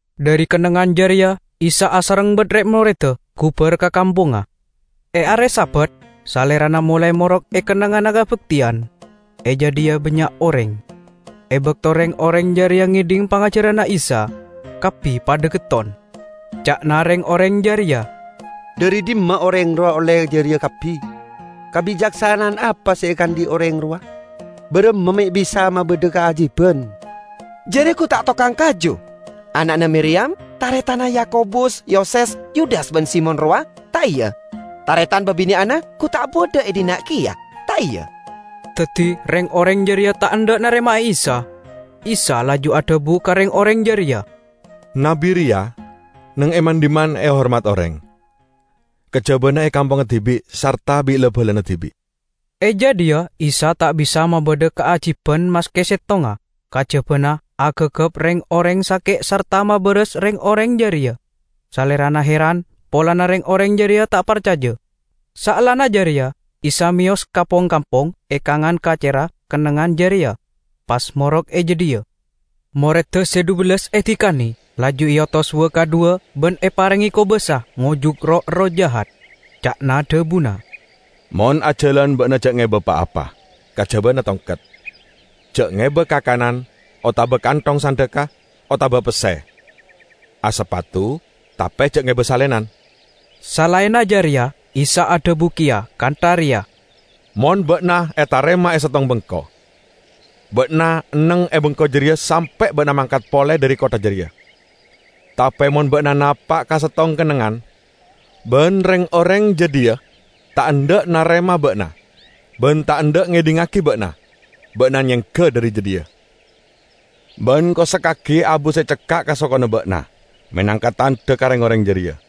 Dhari kennengngan jareya Isa asareng ban red-moredda gubar ka kampongnga. E are Sabat Salerana molae morok e kennengnganna kabakteyan. E jadhiya bannya' oreng. E bakto reng-oreng jareya ngedhing pangajaranna Isa, kabbi padha getton. Ca'na reng-oreng jareya, "Dhari dhimma oreng rowa olle jareya kabbi? Kabicaksana'an apa se ekaandhi' oreng rowa? Baramma me' bisa mabadha kaajiban? Jareya gu ta' tokang kaju, ana'na Miriyam, taretanna Yakobus, Yoses, Yudas ban Simon rowa, ta' iya? Taretan babine'anna gu ta' badha e dhinna' keya, ta' iya?" Daddi reng-oreng jareya ta' endha' narema Isa. Isa laju adhabu ka reng-oreng jareya, "Nabbi reya neng e man-dhimman ehormat oreng, kajabana e kampongnga dibi' sarta bi' la-balana dibi'." E jadhiya Isa ta' bisa mabadha kaajiban maske settonga, kajabana agagap reng-oreng sake' sarta mabaras reng-oreng jareya. Salerana heran polana reng-oreng jareya ta' parcaja. Saellana jareya Isa meyos ka pong-kampong e kangan kacerra kennengngan jareya, pas morok e jadhiya. Moredda se dhubellas edikane, laju eotos wa-kadhuwa ban eparenge kobasa ngojuk roh-erroh jahat. Ca'na dhabuna, "Mon ajalan ba'na ja' ngeba pa-apa, kajabana tongket. Ja' ngeba kakanan otaba kanthong sandhekka, otaba pesse. Asapatu, tape ja' ngeba salenan." Salaenna jareya Isa adhabu keya kantha reya, "Mon ba'na etarema e settong bengko, ba'na enneng e bengko jareya sampe' ba'na mangkat pole dhari kottha jareya. Tape mon ba'na napa' ka settong kennengngan, ban reng-oreng jadhiya ta' endha' narema ba'na ban ta' endha' ngedhingngagi ba'na, ba'na nyengga dhari jadhiya. Ban kosekkagi abu se cekka' ka sokona ba'na menangka tandha ka reng-oreng jareya!"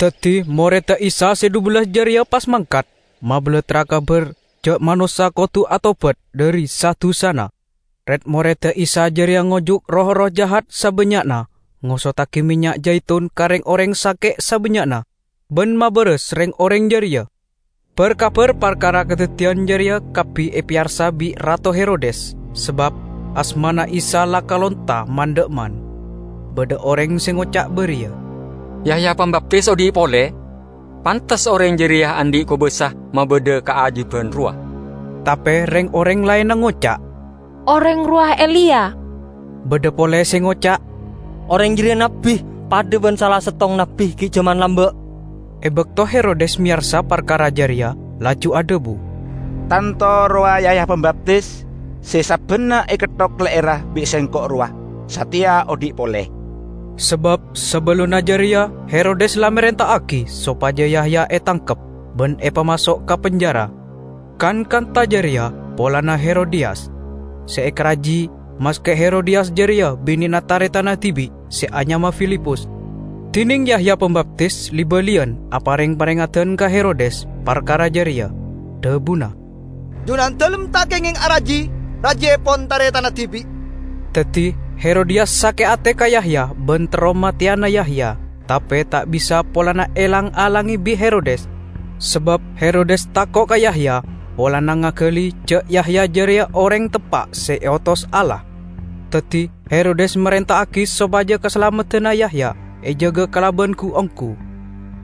Daddi moredda Isa se dhubellas jareya pas mangkat, mabalattra kabar ja' manossa kodu atobat dhari sa-dusana. Red-moredda Isa jareya ngojuk roh-erroh jahat sabannya'na, ngosoddagi mennya' jaitun ka reng-oreng sake' sabannya'na, ban mabaras reng-oreng jareya. Bar-kabar parkara kadaddiyan jareya kabbi epeyarsa bi' Rato Herodes, sabab asmana Isa la kalonta man-dha'emman. Badha oreng se ngoca' bariya, "Yahya Pambaptis odhi' pole! Pantes oreng jareya andhi' kobasa mabadha kaajiban rowa." Tape reng-oreng laenna ngoca', "Oreng rowa Eliya." Badha pole se ngoca', "Oreng jareya nabbi, padha ban sala settong nabbi gi' jaman lamba'." E bakto Herodes meyarsa parkara jareya, laju adhabu, "Tanto rowa Yahya Pambaptis se sabbanna eketthok le'erra bi' Sengko' rowa. Sateya odhi' pole!" Sabab sabellunna jareya Herodes la marenta'agi sopaja Yahya etangkep, ban epamaso' ka penjara. Kan kantha jareya polana Herodiyas, se ekaraji, maske Herodiyas jareya binena taretanna dibi' se anyama Filipus. Dineng Yahya Pambaptis li-baliyan apareng parengeddan ka Herodes parkara jareya, dhabuna, "Junandalem ta' kengeng araji rajiepon taretanna dibi'!" Daddi Herodiyas sake' ate ka Yahya ban terro mateyana Yahya, tape ta' bisa polana elang-alange bi' Herodes. Sabab Herodes tako' ka Yahya, polana ngagali ja' Yahya jareya oreng teppa' se eotos Allah, daddi Herodes marenta'agi sopaja kasalameddanna Yahya ejaga kalaban gu-onggu.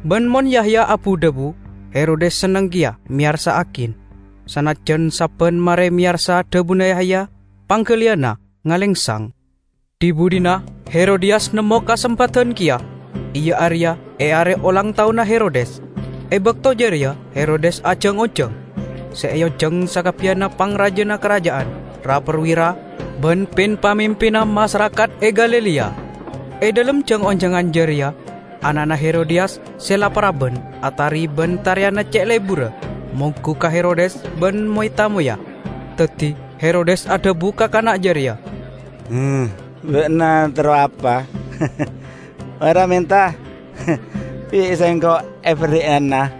Ban mon Yahya abu-dhabu, Herodes senneng keya meyarsa'agi, sanajjan sabban mare meyarsa dhabuna Yahya panggaliyanna ngalengsang. Dhi-budhina Herodiyas nemmo kasempadan keya, iya areya e are olang taonna Herodes. E bakto jareya Herodes ajang-onjang. Se eonjang sakabbiyanna pangrajana karaja'an, ra-parwira, ban pin-pamimpinna masarakat e Galilea. E dhalem jang-onjangan jareya ana'na Herodiyas se la paraban atari ban tariyanna ce' leburra monggu ka Herodes ban moy-tamoyya. Daddi Herodes adhabu ka kana' jareya, "Ba'na terro apa, mara menta. Bi' sengko' eberri'ana!"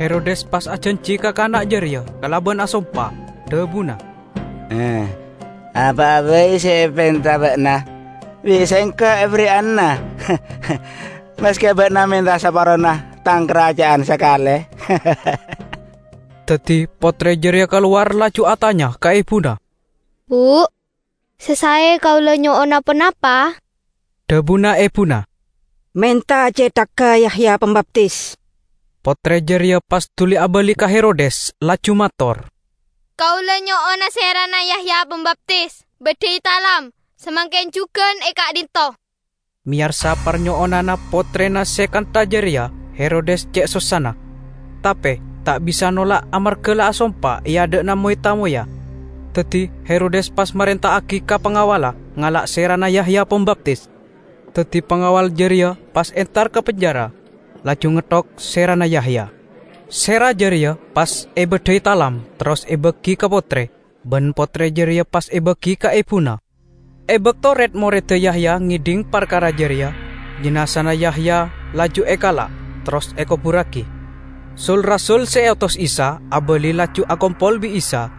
Herodes pas ajanji ka kana' jareya kalaban asompa. Dhabuna, "Apa'a bai se epenta ba'na bi' sengko' eberri'ana, maske ba'na menta saparona tang karaja'an sakale!" Daddi pottre jareya kalowar laju atanya ka ebuna, "Bu, se sae kaula nyo'ona ponapa?" Dhabuna ebuna, "Menta cethagga Yahya Pambaptis." Pottre jareya pas duli abali ka Herodes laju mator, "Kaula nyo'ona serana Yahya Pambaptis, baddhai talam, samangken jugan e ka'dhinto'!" Meyarsa parnyo'onanna pottrena se kantha jareya Herodes ce' sossana, tape ta' bisa nolak amarga la asompa e adha'na moy-tamoyya. Daddi Herodes pas marenta'agi ka pangawalla ngala' serana Yahya Pambaptis. Daddi pangawal jareya pas entar ka penjara, laju ngetthok serana Yahya. Sera jareya pas ebaddhai talam terros ebagi ka pottre. Ban pottre jareya pas ebagi ka ebuna. E bakto red-moredda Yahya ngedhing parkara jareya, jinazana Yahya laju ekala', terros ekoburragi. Sul-rasul se eotos Isa abali laju akompol bi' Isa,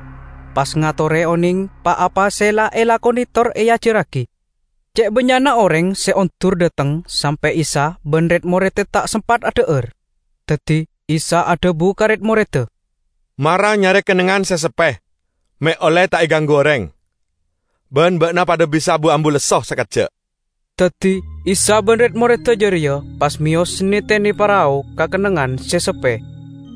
pas ngatore oneng pa-apa se la elakone tor eajarragi. Ce' bannya'na oreng se ondur dhateng sampe' Isa ban red-moredda ta' sempat adha'ar. Daddi Isa adhabu ka red-moredda, "Mara nyare kennengngan se seppe me' olle ta' eganggu oreng, ban ba'na padha bisa bu-ambu lesso sakejja'." Daddi Isa ban red-moredda jareya pas meyos netene parao ka kennengngan se seppe.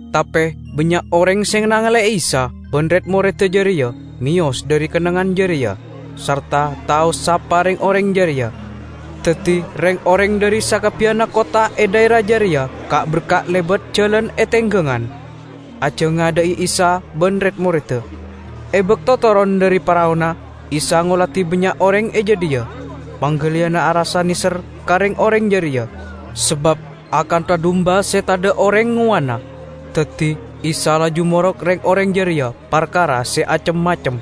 Tape bannya' oreng se nangale'e Isa ban red-moredda jareya meyos dhari kennengngan jareya, sarta tao sapa reng-oreng jareya. Daddi reng-oreng dhari sakabbiyanna kottha e dhaera jareya ka'-berka' lebat jalan e tenggangan, ajangadha'i Isa ban red-moredda. E bakto toron dhari paraona Isa ngoladi bannya' oreng e jadhiya. Panggaliyanna arassa neser ka reng-oreng jareya, sabab akantha dumba se tadha' oreng ngowanna. Daddi Isa laju morok reng-oreng jareya parkara se acem-macem.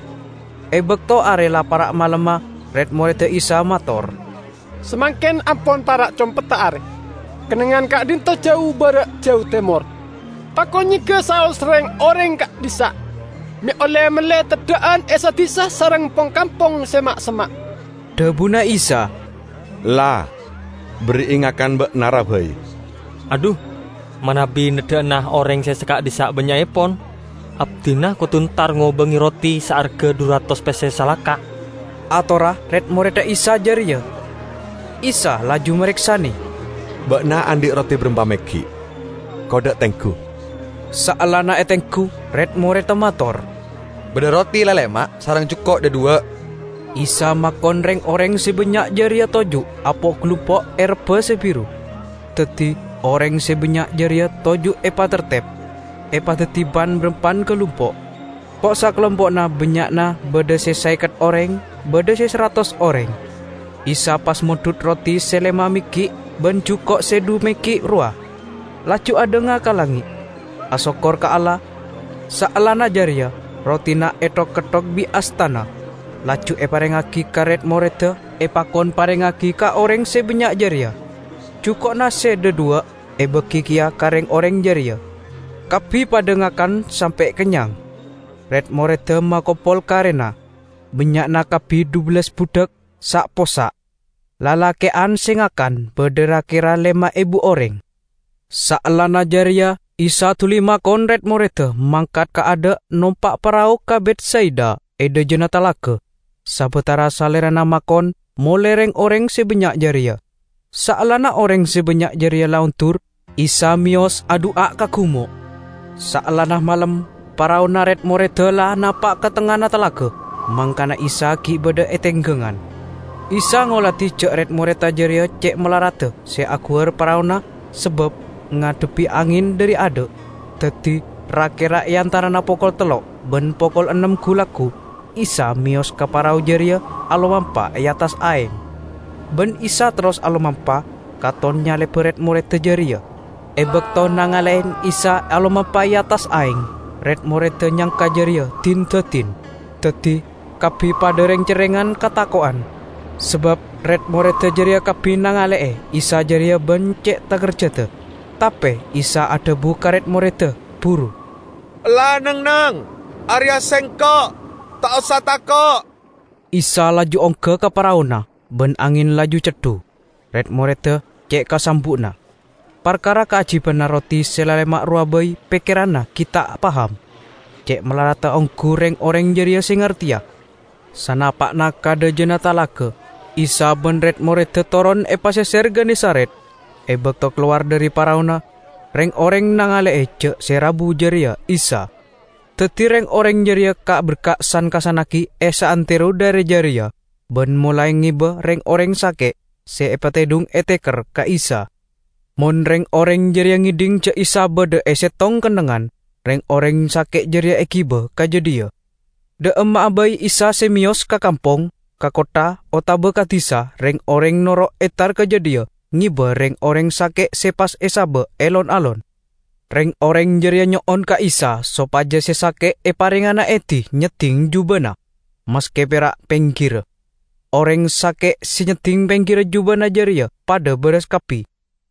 E bakto are la para' malemma, red-moredda Isa mator, "Samangken ampon para' compedda are, kennengngan ka'dhinto' jau bara' jau temor. Pakon nyengga saos reng-oreng ka'dhissa', me' olle melle teddha'an e sa-disa sareng pong-kampong se ma'-semma'." Dhabuna Isa, "La berri'i ngakan ba'na, ra, bai." "Adhu, manabi neddha'ana oreng se saka'dhissa' bannya'epon, abdina kodu entar ngobange roti saarga dhu ratos pesse salaka," atorra red-moredda Isa jareya. Isa laju mareksane, "Ba'na andhi' roti barampa meggi'? Kodda' tenggu." Saellana etenggu, red-moredda mator, "Badha roti lalema' sareng juko' dhadhuwa'." Isa makon reng-oreng se bannya' jareya toju' apo'-galumpo' e rebba se biru. Daddi oreng se bannya' jareya toju' epatartep, epadaddi pan-barampan galumpo'. Po'-sakalumpo'na bannya'na badha se saeket oreng, badha se saratos oreng. Isa pas mondhut roti se lema meggi' ban juko' se dhu meggi' rowa, laju adhanga ka langnge', asokkor ka Allah. Saellana jareya, rotina ethok-ketthok bi' astana, laju eparengngagi ka red-moredda epakon parengngagi ka oreng se bannya' jareya. Juko'na se dhadhuwa' ebagi keya ka reng-oreng jareya. Kabbi padha ngakan sampe' kennyang. Red-moredda makompol karena, bannya'na kabbi dhubellas budhak, sa'-possa'. Lalake'an se ngakan badha ra-kera lema ebu oreng. Saellana jareya Isa duli makon red-moredda mangkat kaadha' nompa' parao ka Betsaida e dhajana talaga, sabatara Salerana makon mole reng-oreng se bannya' jareya. Saellana oreng se bannya' jareya la ondur, Isa meyos adu'a ka gumo'. Saellana malem, paraona red-moredda la napa' ka tengngana talaga, mangkana Isa gi' badha e tenggangan. Isa ngoladi ja' red-moredda jareya ce' malaradda se aguwar paraona sabab ngadhebbi angen dhari adha'. Daddi, ra-kera e antarana pokol tello' ban pokol ennem gu-laggu, Isa meyos ka parao jareya alomampa e attas aeng. Ban Isa terros alomampa, katon nyaleba red-moredda jareya. E bakto nangale'e Isa alomampa e attas aeng, red-moredda nyangka jareya din-dadin, daddi kabbi padha reng-cerrengan katako'en. Sabab red-moredda jareya kabbi nangale'e Isa jareya ban ce' takerjadda. Tape Isa adhabu ka red-moredda buru, "Ella neng-enneng! Areya Sengko'. Ta' osa tako'!" Isa laju ongga ka paraona, ban angen laju ceddu. Red-moredda ce' kasambu'na. Parkara kaajibanna roti se lalema' rowa bai pekkeranna gi' ta' paham. Ce' malaradda onggu reng-oreng jareya se ngarteya. Sanapa'na ka dhajana talaga, Isa ban red-moredda toron e paseser Genesaret. E bakto kalowar dhari paraona, reng-oreng nangale'e ja' se rabu jareya Isa. Daddi reng-oreng jareya ka'-berka' san-kassannagi e saantero dhaera jareya, ban molae ngeba reng-oreng sake' se epatedhung e teker ka Isa. Mon reng-oreng jareya ngedhing ja' Isa badha e settong kennengngan, reng-oreng sake' jareya egiba ka jadhiya. Dha' emma'a bai Isa se meyos -- ka kampong, ka kottha otaba ka disa -- reng-oreng noro' entar ka jadhiya ngeba reng-oreng sake' se pas esaba' e lon-alon. Reng-oreng jareya nyo'on ka Isa sopaja se sake' eparengngana edi nyedding jubana, maske pera' penggirra. Oreng sake' se nyedding penggirra jubana jareya padha baras kabbi.